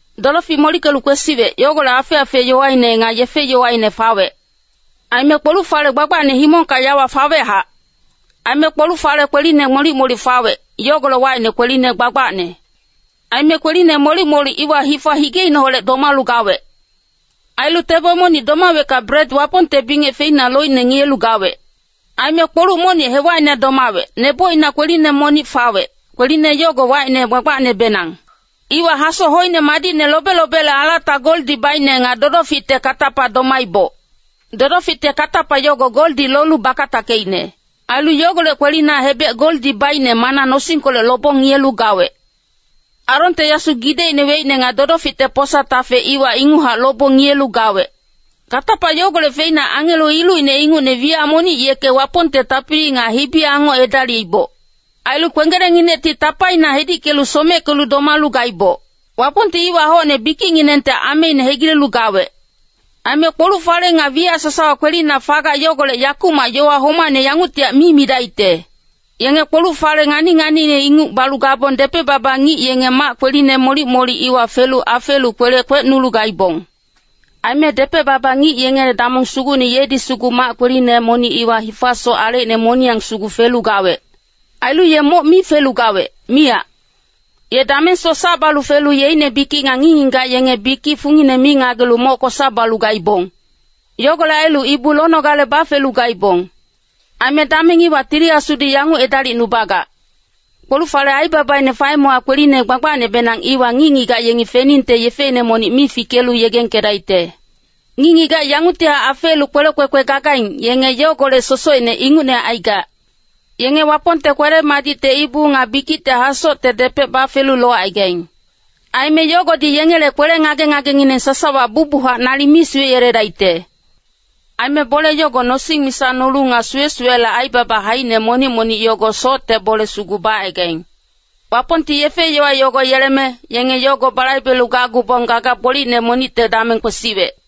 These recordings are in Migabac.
Dodofic molickelu kwesiwec, yogolec afec-afec yowaine nga yefe-yowaine fawec. Aime kpoluc-fale gbagbacne himongka yawa fawechac. Aime kpoluc-fale kweline molic-molic fawec, yogolec wacine Kweline Gbagbacne. Aime kweline molic-molic iwa hifa higeineholec domalu gawec. Ailu tebo monic domawecka bret Wapongte bingec feina loicne ngiyelu gawec. Aime kpoluc monic hewacina domawec, nebocina kweline monic fawec, kweline yogo wacine Gbagbacnebenang. Iwa hasoc hoine madicne lobe-lobele alata goldi baicne nga dodoficte katapa domaiboc. Dodoficte katapa yogo goldi lolu bakatackeicne. Ailu yogolec kwelina hebec goldi baicne mana nosingkolec lobong ngiyelu gawec. Aronte yasu gidecine weicne nga dodoficte posa-tafe iwa inguchac lobong ngiyelu gawec. Katapa yogolec feina angelo ilucine ingucne wiyac monic yeke Wapongte tapili nga hibi-angoc edaliiboc. Ailu kwenggelengnginecti tapaina hedickelu someckelu domalu gaiboc. Wapongti iwa hocne bikicnginengte ameine hegilelu gawec. Aime kpoluc-fale nga wiyac sasawa kwelina fagac yogolec yakumac yowa homacne yanguctihac mi midacte. Yenge kpoluc-fale ngani-nganiine inguc balu gabong depec-baba ngic yenge mac kweline molic-molic iwa felu afeelu kwelec kwecnolu gaibong. Aime depec-baba ngic yengele damong sugucne yedi sugu mac kweline monic iwa hifasoc alecine moniyang sugu felu gawec. Ailu ye moc mi felu gawec, miyac. Ye damengsoc sac balu felu yeicne bikic nga ngic-ngigac yenge bikic fungine mi ngagelu moc kosa balu gaibong. Yogolec ailu ibu lonogale bafelu gaibong. Aime dameng iwa Tili Asudi yanguc edalicnubagac. Kpoluc-falele aibabaine faemewa Kweline Gbagbacnebenang iwa ngic-ngigac yengi feningte yefeine monic mi fikelu yegengkedaicte. Ngic-ngigac yanguctihac afeelu kwelec kwekwe gagaing, yenge yogolec sosocine ingucne aigac. Yenge Wapongte kwele-madicte ibu nga bikicte hasocte depec bafelu locaigaing. Aime yogodi yengele kwele ngage-ngagengineng sasawa bucbuchac nalic mi suweyeledaicte. Aime bole yogo nosing misa nolu nga suwe-suwele aibaba haicine monic-monic yogo socte bole sugu bacaigaing. Wapongti yefe-yowa yogo yeleme, yenge yogo balaibelu gacgubong gaga gbolicne monicte dameng kwesiwec.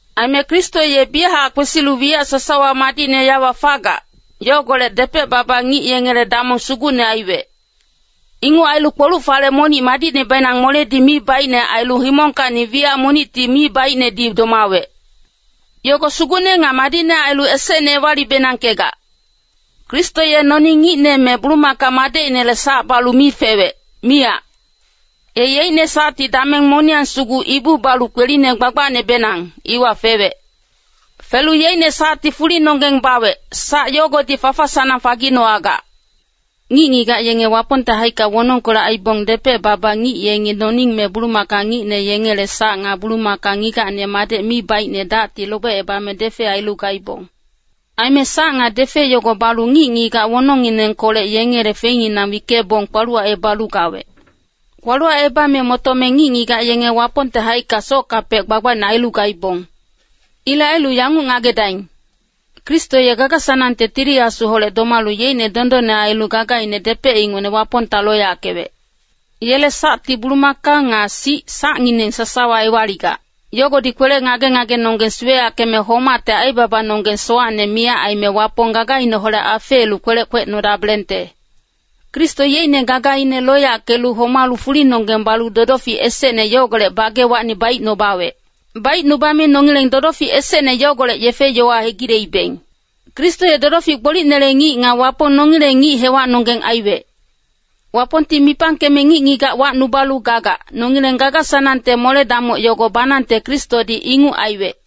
Aime Kristo ye biyachac kwesilu wiyac sasawa madicne yawa fagac, yogolec depec-baba ngic yengele damong sugucne aiwec. Inguc ailu kpoluc-fale monic madicnebenang moledi mi baicne ailu himongkacni wiyac monicti mi baicnedi domawec. Yogo sugucne nga madicne ailu esecne ewali-benangkegac. Kristo ye noning ngicne me bulumaka madecinele sac balu mi fewec, miyac. Ye yeicne sacti dameng moniyang sugu ibu balu Kweline Gbagbacnebenang, iwa fewec. Felu yeicne sacti fulinonggeng bawec, sac yogodi fafa-sanang faginowagac. Ngic-ngigac yenge Wapongte haicka wonongkolec aibong depec-baba ngic yengi noning me bulumaka ngicne yengele sac nga bulumaka ngigacne madec mi baicne dacti lobecebame defe ailu gaibong. Aime sac nga defe yogo balu ngic-ngigac wonongnginengkolec yengele feinginang wickebong kpaluwacebalu gawec. Kpaluwacebame motome ngic-ngigac yenge Wapongte haicka sockapec gbagbacne ailu gaibong. Ilec ailu yanguc ngagedaing, Kristo ye gaga-sanangte Tili Asuholec domalu yeicne dondonne ailu gagaine depec ingucne Wapongta loyackewec. Yele sacti bulumaka nga sic sacngineng sasawa ewaligac. Yogodi kwele ngage-ngagenonggeng suweyackeme homacte aibabanonggeng sowacne miyac aime Wapong gagaineholec afeelu kwelec kwecnodabelengte. Kristo yeicne gagaine loyackelu homalu fulinonggeng balu dodofic esecne yogolec bagewacni baicnubawec. Baicnubame nongileng dodofic esecne yogolec yefe-yowa hegileibeng. Kristo ye dodofic gbolicnele ngic nga Wapong nongileng ngic hewacnonggeng aiwec. Wapongti mipangkeme ngic-ngigac wacnubalu gagac, nongileng gaga-sanangte mole-damoc yogo banangte Kristodi inguc aiwec.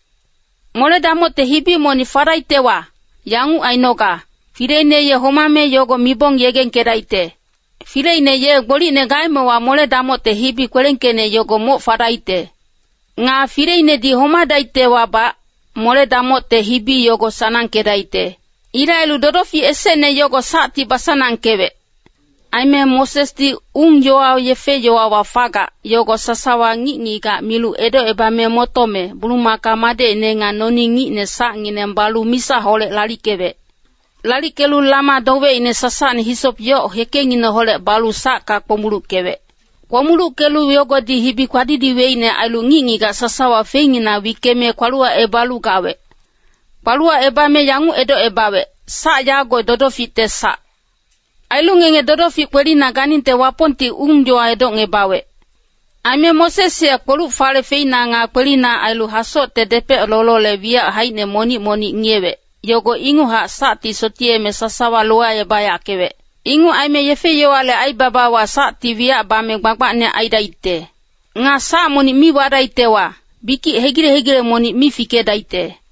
Mole-damocte hibi monic fadaictewa, yanguc ainoga, fileine ye homame yogo mibong yegengkedaicte. Fileine ye gbolicne gaemewa mole-damocte hibi kwelengkeicne yogo moc fadaicte. Nga fileinedi homadaictewabac, mole-damocte hibi yogo sanangkedaicte. Ilec ailu dodofic esecne yogo sacti basanangkewec. Aime Mosesdi ung-yowa yefe-yowawa fagac, yogo sasawa ngic-ngigac milu edocebame motome, bulumaka madecine nga noning ngicne sacngineng balu misaholec lalickewec. Lalickelu lama dowecine sasacne hisop yoc hekengineholec balu sacka kpomuluckewec. Kpomuluckelu yogodi hibi kpadidiweicne ailu ngic-ngigac sasawa feinginang wickeme kpaluwacebalu gawec. Kpaluwacebame yanguc edocebawec, “Sac yago dodoficte sac. Ailu ngenge dodofic kwelina ganingte Wapongti ung-yowa edocngebawec.” Aime Moses ye kpoluc-fale feina nga kwelina ailu hasocte depec lolole wiyac haicine monic-monic ngiyewec, yogo inguchac sacti sotiyeme sasawa lowacebayackewec. Inguc aime yefe-yowale aibabawa sacti wiyac bame gbagbacne aidaicte. Nga sac monic mi wadaictewa, bikic hegile-hegile monic mi fikedaicte.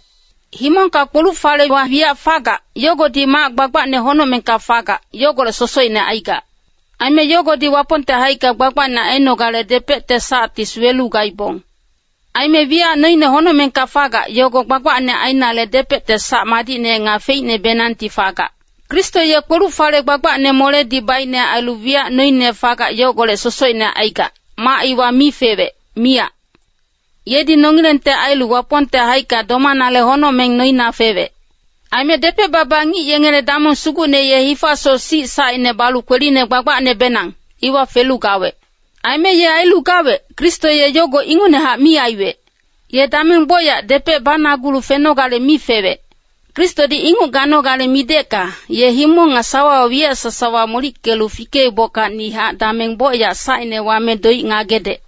Himongka kpoluc-falewa wiyac fagac, yogodi mac gbagbacne honocmengka fagac, yogolec sosocine aigac. Aime yogodi Wapongte haicka gbagbacne ainogale depecte sacti suwelu gaibong. Aime wiyac noine honocmengka fagac, yogo gbagbacne ainale depecte sac madicne nga feicnebenangti fagac. Kristo ye kpoluc-fale gbagbacne moledi baicne ailu wiyac noine fagac yogolec sosocine aigac, mac iwa mi fewec, miyac. Yedi nongilengte ailu Wapongte haicka domanale honocmeng noina fewec. Aime depec-baba ngic yengele damong sugucne ye hifasoc sic sacine balu Kweline Gbagbacnebenang, iwa felu gawec. Aime ye ailu gawec, Kristo ye yogo ingucnehac mi aiwec. Ye dameng bocyac depec banagulu fenogale mi fewec. Kristodi inguc ganogale midecka, ye himong nga sawawa wiyac sasawa molickelu fikeibockacnihac dameng bocyac sacine wame doic ngagedec.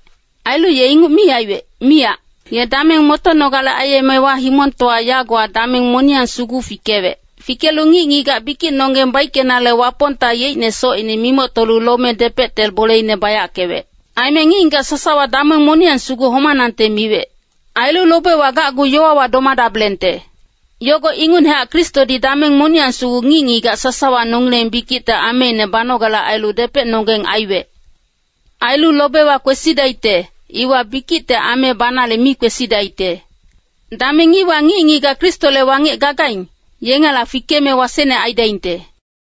Ailu ye inguc mi aiwec, miyac. Ye dameng motonogale aiyemewa himongtowa yagowa dameng moniyang sugu fikewec. Fikelu ngic-ngigac bikicnonggeng baickenale Wapongta yeicne socine mimoctolu lome depecte boleine bayackewec. Aime ngic-ngigac sasawa dameng moniyang sugu homanangte miwec. Ailu lobewa gacgu yowawa domadabelengte. Yogo ingucnehac Kristodi dameng moniyang sugu ngic-ngigac sasawa nongileng bikicte ameine banogale ailu depecnonggeng aiwec. Ailu lobewa kwesidaicte, iwa bikicte ame banale mi kwesidaicte. Dameng iwa ngic-ngigac Kristole wangec gagaing, yengela fikeme wasecne aidaingte.